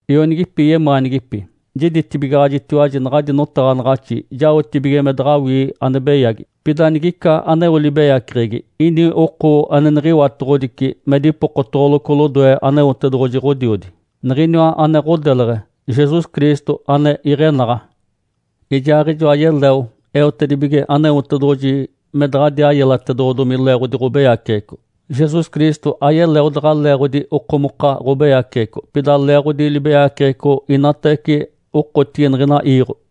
Ionigipi yemaanigipi. Jiditibigaɡ̶ajitiwaji naɡ̶adi notaɡ̶anaɡ̶axi jaotibige me daɡ̶awii ane beyagi. Pida nigica aneo libeyaceɡ̶egi, ini oko ane niɡ̶iwatoɡ̶odici me dipokotoɡ̶oloco lodoe Aneotedoɡ̶oji Ǥodiodi. Niɡ̶iniwa ane ɡ̶odeleɡ̶e, Jesus Cristo ane iɡ̶enaɡ̶a. Ijaaɡ̶ijoa yeleo eotedibige Aneotedoɡ̶oji me daɡ̶adiaa yelatedoɡ̶odomi leeɡ̶odi ɡ̶obeyaceɡ̶eco. Jesus Cristo ayeleo daɡ̶a leeɡ̶odi okomoka ɡ̶obeyaceɡ̶eco, pida leeɡ̶odi libeyaceɡ̶eco inatawece okotigi niɡ̶ina iiɡ̶o.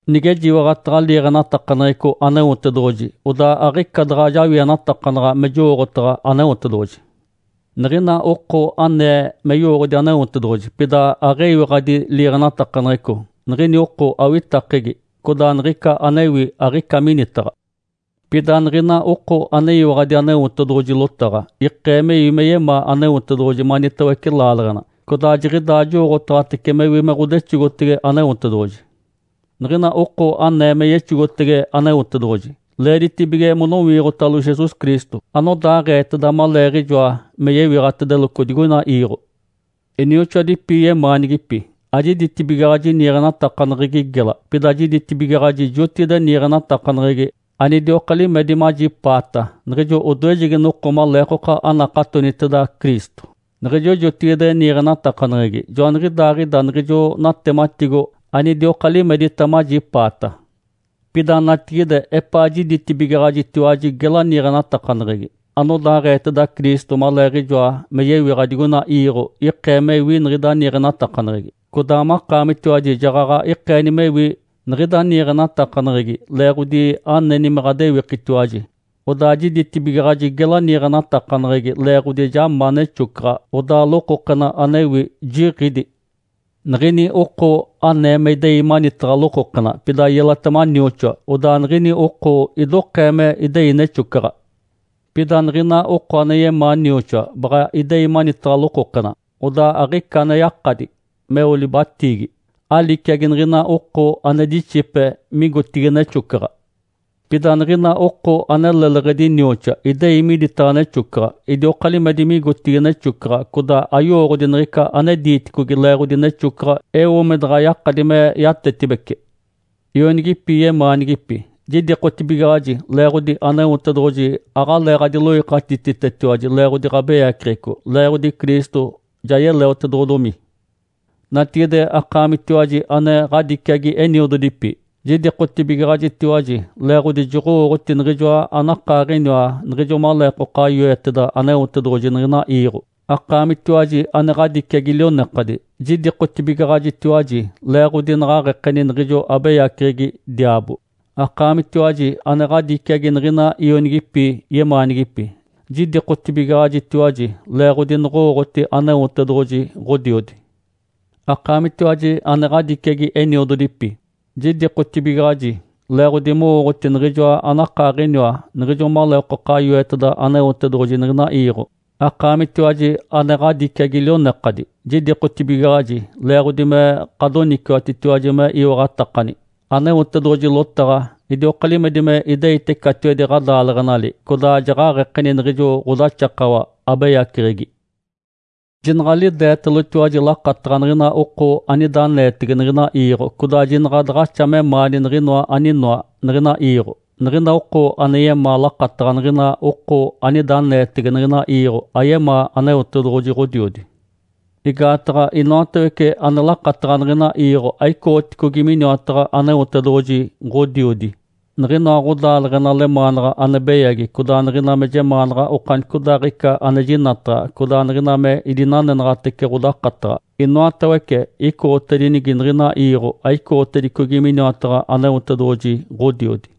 Nigejiwaɡ̶ataɡ̶a liiɡ̶enatakaneɡ̶eco Aneotedoɡ̶oji, odaa aɡ̶ica daɡ̶a jawienatakanaɡ̶a me jowooɡ̶otaɡ̶a Aneotedoɡ̶oji. Niɡ̶ina oko anee me yowooɡ̶odi Aneotedoɡ̶oji, pida aɡ̶eyiwaɡ̶adi liiɡ̶enatakaneɡ̶eco, niɡ̶ini oko awitakegi, codaa niɡ̶ica anewi aɡ̶ica minitaɡ̶a. Pida niɡ̶ina oko aneyiwaɡ̶adi Aneotedoɡ̶oji lotaɡ̶a, ikee mewi me yemaa Aneotedoɡ̶oji manitawece laaleɡ̶ena. Codaa jiɡ̶idaa jowooɡ̶otaɡ̶atece mewi me ɡ̶odexogotege Aneotedoɡ̶oji. Niɡ̶ina oko anee me yexogotege Aneotedoɡ̶oji, leeditibige monowiiɡ̶otalo Jesus Cristo, anodaaɡ̶eeteda maleeɡ̶ijoa me yewiɡ̶atedeloco digoina iiɡ̶o. Inioxoadipi yemaanigipi. Ajiditibigaɡ̶aji niiɡ̶enatakaneɡ̶egi gela, pida jiditibigaɡ̶aji jotigide niiɡ̶enatakaneɡ̶egi anidioka limedi majipaata niɡ̶ijo odoejegi noko maleekoka anakatoniteda Cristo. Niɡ̶ijo jotigide niiɡ̶enatakaneɡ̶egi joaniɡ̶idaaɡ̶ida niɡ̶ijo natematigo anidioka limedita majipaata. Pida natigide epaa jiditibigaɡ̶ajitiwaji gela niiɡ̶enatakaneɡ̶egi. Anodaaɡ̶eeteda Cristo maleeɡ̶ijoa me yewiɡ̶a digoina iiɡ̶o ikee mewi niɡ̶ida niiɡ̶enatakaneɡ̶egi. Codaa makaamitiwaji jaɡ̶aɡ̶a ikeeni mewi niɡ̶ida niiɡ̶enatakaneɡ̶egi leeɡ̶odi aneni me ɡ̶adewikitiwaji. Odaa jiditibigaɡ̶aji gela niiɡ̶enatakaneɡ̶egi leeɡ̶odi ja ma nexocaɡ̶a, odaa lokokena anewi jiɡ̶ídi. Nigini oko anee me idei manitaɡ̶a lokokena, pida yelatema nioxoa, odaa niɡ̶ini oko idokee me idei nexocaɡ̶a. Pida niɡ̶ina oko ane yemaa nioxoa baɡ̶a idei manitaɡ̶a lokokena, odaa aɡ̶ica ane yakadi meo libatiigi, aliciagi niɡ̶ina oko ane dixipe migotigi nexocaɡ̶a. Pida niɡ̶ina oko ane leleɡ̶edi nioxoa idei miditaɡ̶a nexocaɡ̶a. Idioka limedi migotigi nexocaɡ̶a, codaa ayowooɡ̶odi niɡ̶ica ane diiticogi leeɡ̶odi nexocaɡ̶a eo me daɡ̶a yakadi me yatetibece. Ionigipi yemaanigipi. Jidikotibigaɡ̶aji leeɡ̶odi Aneotedoɡ̶oji aɡ̶alee ɡ̶adiloikatititetiwaji leeɡ̶odi ɡ̶abeyaceɡ̶eco, leeɡ̶odi Cristo ja yeleotedoɡ̶odomi. Natigide, akaamitiwaji ane ɡ̶adiciagi eniododipi. Jidikotibigaɡ̶ajitiwaji leeɡ̶odi joɡ̶owooɡ̶oti Niɡ̶ijoa anakaaɡ̶iniwa niɡ̶ijo maleekoka yoeteda Aneotedoɡ̶oji niɡ̶ina iiɡ̶o. Akaamitiwaji ane ɡ̶adiciagi lionekadi. Jidikotibigaɡ̶ajitiwaji leeɡ̶odi naɡ̶aɡ̶ekeni niɡ̶ijo abeyaceɡ̶egi, diaabo. Akaamitiwaji ane ɡ̶adiciagi niɡ̶ina ionigipi yemaanigipi. Jidikotibigaɡ̶ajitiwaji leeɡ̶odi noɡ̶owooɡ̶oti Aneotedoɡ̶oji, Ǥodiodi. Akaamitiwaji ane ɡ̶adiciagi eniododipi. Jidikotibigaɡ̶aji leeɡ̶odi mowooɡ̶oti Niɡ̶ijoa anakaaɡ̶iniwa niɡ̶ijo maleekoka yoeteda Aneotedoɡ̶oji niɡ̶ina iiɡ̶o. Akaamitiwaji ane ɡ̶adiciagi lionekadi. Jidikotibigaɡ̶aji leeɡ̶odi me ɡ̶adoniciwatitiwaji me iwaɡ̶atakani. Aneotedoɡ̶oji lotaɡ̶a idioka limedi me ideite catiwedi ɡ̶adaaleɡ̶enali, codaa jaɡ̶aɡ̶ekeni niɡ̶ijo ɡ̶odaxakawa abeyaceɡ̶egi. Jinaɡ̶alideetalotiwaji lakataɡ̶a niɡ̶ina oko anida aneetege niɡ̶ina iiɡ̶o, codaa jinaɡ̶a daɡ̶axa memaani niɡ̶inoa aninoa niɡ̶ina iiɡ̶o. Niɡ̶ina oko ane yemaa lakataɡ̶a niɡ̶ina oko anida aneetege niɡ̶ina iiɡ̶o ayemaa Aneotedoɡ̶oji Ǥodiodi. Igaataɡ̶a inoatawece ane lakataɡ̶a niɡ̶ina iiɡ̶o aicoɡ̶oticogi miniwataɡ̶a Aneotedoɡ̶oji, Ǥodiodi. Niɡ̶inoa ɡ̶odaaleɡ̶ena lemaanaɡ̶a ane beyagi, codaa niɡ̶ina me jemaanaɡ̶a okanicodaaɡ̶ica ane jinataɡ̶a, codaa niɡ̶ina me idinanenaɡ̶atece ɡ̶odakataɡ̶a, inoatawece icoɡ̶otedinigi niɡ̶ina iiɡ̶o, aicoɡ̶otedicogi miniwataɡ̶a Aneotedoɡ̶oji, Ǥodiodi.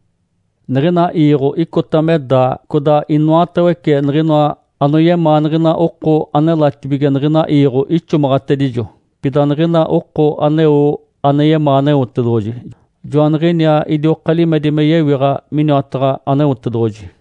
Niɡ̶ina iiɡ̶o icota me daa, codaa inoatawece niɡ̶inoa anoyemaa niɡ̶ina oko anelatibige niɡ̶ina iiɡ̶o ixomaɡ̶atedijo. Pida niɡ̶ina oko aneo ane yemaa Aneotedoɡ̶oji, joaniɡ̶iniaa idioka limedi me yewiɡ̶a miniwataɡ̶a Aneotedoɡ̶oji.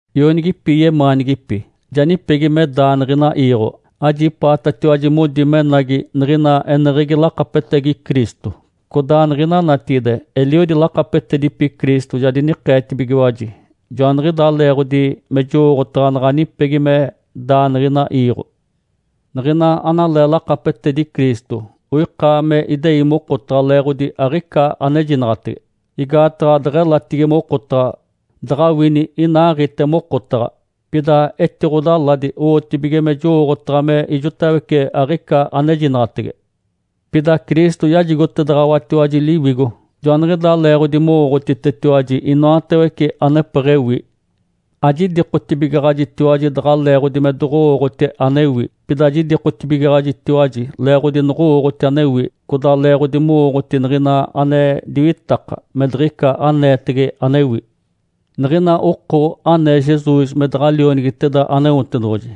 Ionigipi yemaanigipi. Ja nipegi me daa niɡ̶ina iiɡ̶o. Ajipaatatiwaji modi menagi niɡ̶ina eneɡ̶egi lakapetegi Cristo, codaa niɡ̶ina natigide, eliodi lakapetedipi Cristo ja dinikeetibigiwaji. Joaniɡ̶idaa leeɡ̶odi me jowooɡ̶otaɡ̶a naɡ̶a nipegi me daa niɡ̶ina iiɡ̶o. Niɡ̶ina analee lakapetedi Cristo oika me idei mokotaɡ̶a leeɡ̶odi aɡ̶ica anejinaɡ̶atege. Igaataɡ̶a deɡ̶elatigi mokotaɡ̶a, daɡ̶awini inaaɡ̶ite mokotaɡ̶a. Pida etiɡ̶odaladi owotibige me jowooɡ̶otaɡ̶a me ijotawece aɡ̶ica anejinaɡ̶atege. Pida Cristo yajigotedaɡ̶awatiwaji Liwigo, joaniɡ̶idaa leeɡ̶odi mowooɡ̶otitetiwaji inoatawece anepeɡ̶ewi. Ajidikotibigaɡ̶ajitiwaji daɡ̶a leeɡ̶odi me doɡ̶owooɡ̶oti anewi. Pida jidikotibigaɡ̶ajitiwaji leeɡ̶odi noɡ̶owooɡ̶oti anewi, codaa leeɡ̶odi mowooɡ̶oti niɡ̶ina ane diwitaka, me diɡ̶ica aneetege anewi. Niɡ̶ina oko anee Jesus me daɡ̶a Lionigiteda Aneotedoɡ̶oji,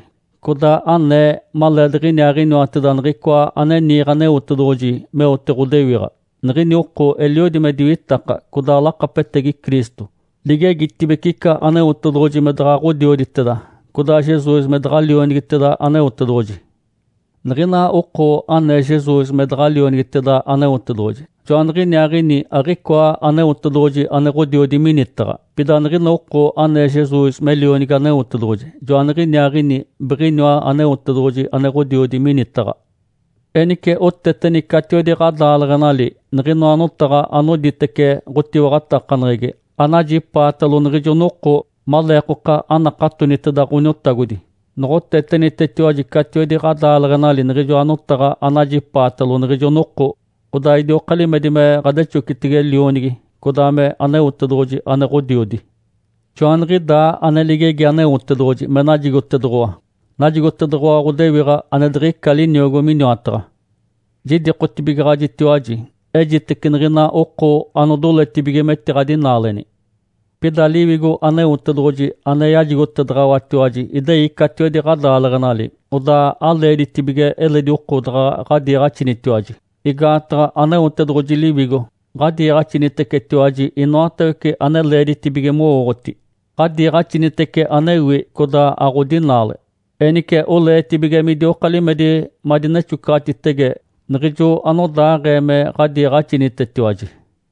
codaa anee maleediɡ̶iniaaɡ̶iniwateda Niɡ̶icoa ane niiɡ̶e Aneotedoɡ̶oji meote ɡ̶odewiɡ̶a, niɡ̶ini oko eliodi me diwitaka, codaa lakapetegi Cristo. Ligegitibece ica Aneotedoɡ̶oji me daɡ̶a Ǥodioditeda, codaa Jesus me daɡ̶a Lionigiteda Aneotedoɡ̶oji. Niɡ̶ina oko anee Jesus me daɡ̶a Lionigiteda Aneotedoɡ̶oji, joaniɡ̶iniaaɡ̶ini aɡ̶icoa Aneotedoɡ̶oji ane Ǥodiodi minitaɡ̶a. Pida niɡ̶ina oko anee Jesus me Lionigi Aneotedoɡ̶oji, joaniɡ̶iniaaɡ̶ini biɡ̶iniwa Aneotedoɡ̶oji ane Ǥodiodi minitaɡ̶a. Enice oteteni catiwedi ɡ̶adaaleɡ̶enali niɡ̶inoa notaɡ̶a anoditece ɡ̶otiwaɡ̶atakaneɡ̶egi anajipaatalo niɡ̶ijo noko maleekoka anakatoniteda Ǥoniotagodi. Noɡ̶otetenitetiwaji catiwedi ɡ̶adaaleɡ̶enali niɡ̶ijoa notaɡ̶a anajipaatalo niɡ̶ijo noko, odaa idioka limedi me ɡ̶adexocitege Lionigi, codaa me Aneotedoɡ̶oji ane Ǥodiodi. Joaniɡ̶idaa ane ligegi Aneotedoɡ̶oji me najigotedoɡ̶owa. Najigotedoɡ̶owa ɡ̶odewiɡ̶a ane diɡ̶ica liniogo miniwataɡ̶a. Jidikotibigaɡ̶ajitiwaji ejitece niɡ̶ina oko anodoletibige metiɡ̶adinaaleni. Pida Liwigo Aneotedoɡ̶oji ane yajigotedaɡ̶awatiwaji idei catiwedi ɡ̶adaaleɡ̶enali, odaa aleeditibige eledi oko daɡ̶a ɡ̶adiiɡ̶axinitiwaji, igaataɡ̶a Aneotedoɡ̶oji Liwigo ɡ̶adiiɡ̶axinitecetiwaji inoatawece ane leeditibige mowooɡ̶oti. Ǥadiiɡ̶axinitece anewi, codaa aɡ̶odinaale. Enice oleetibige midioka limedi madinexocaɡ̶atitege, niɡ̶ijo anodaaɡ̶ee me ɡ̶adiiɡ̶axinitetiwaji.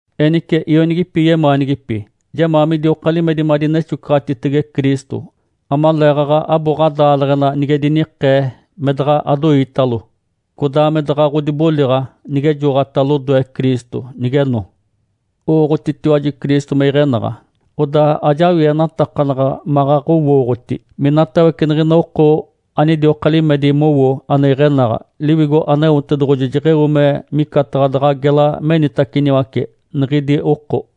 Enice ionigipi yemaanigipi, jemaa midioka limedi madinexocaɡ̶atitege Cristo, amaleeɡ̶aɡ̶a abo ɡ̶adaaleɡ̶ena nige dinikee, me daɡ̶a adoiitalo. Codaa me daɡ̶a ɡ̶odiboliɡ̶a nigejoɡ̶ota lodoe Cristo nigeno. Owooɡ̶otitiwaji Cristo me iɡ̶enaɡ̶a. Odaa ajawienatakanaɡ̶a maɡ̶aɡ̶owooɡ̶oti minatawece niɡ̶ina oko anidioka limedi mowo ane iɡ̶enaɡ̶a, Liwigo Aneotedoɡ̶oji jeɡ̶eo me micataɡ̶a daɡ̶a gela menitaciniwace niɡ̶idi oko.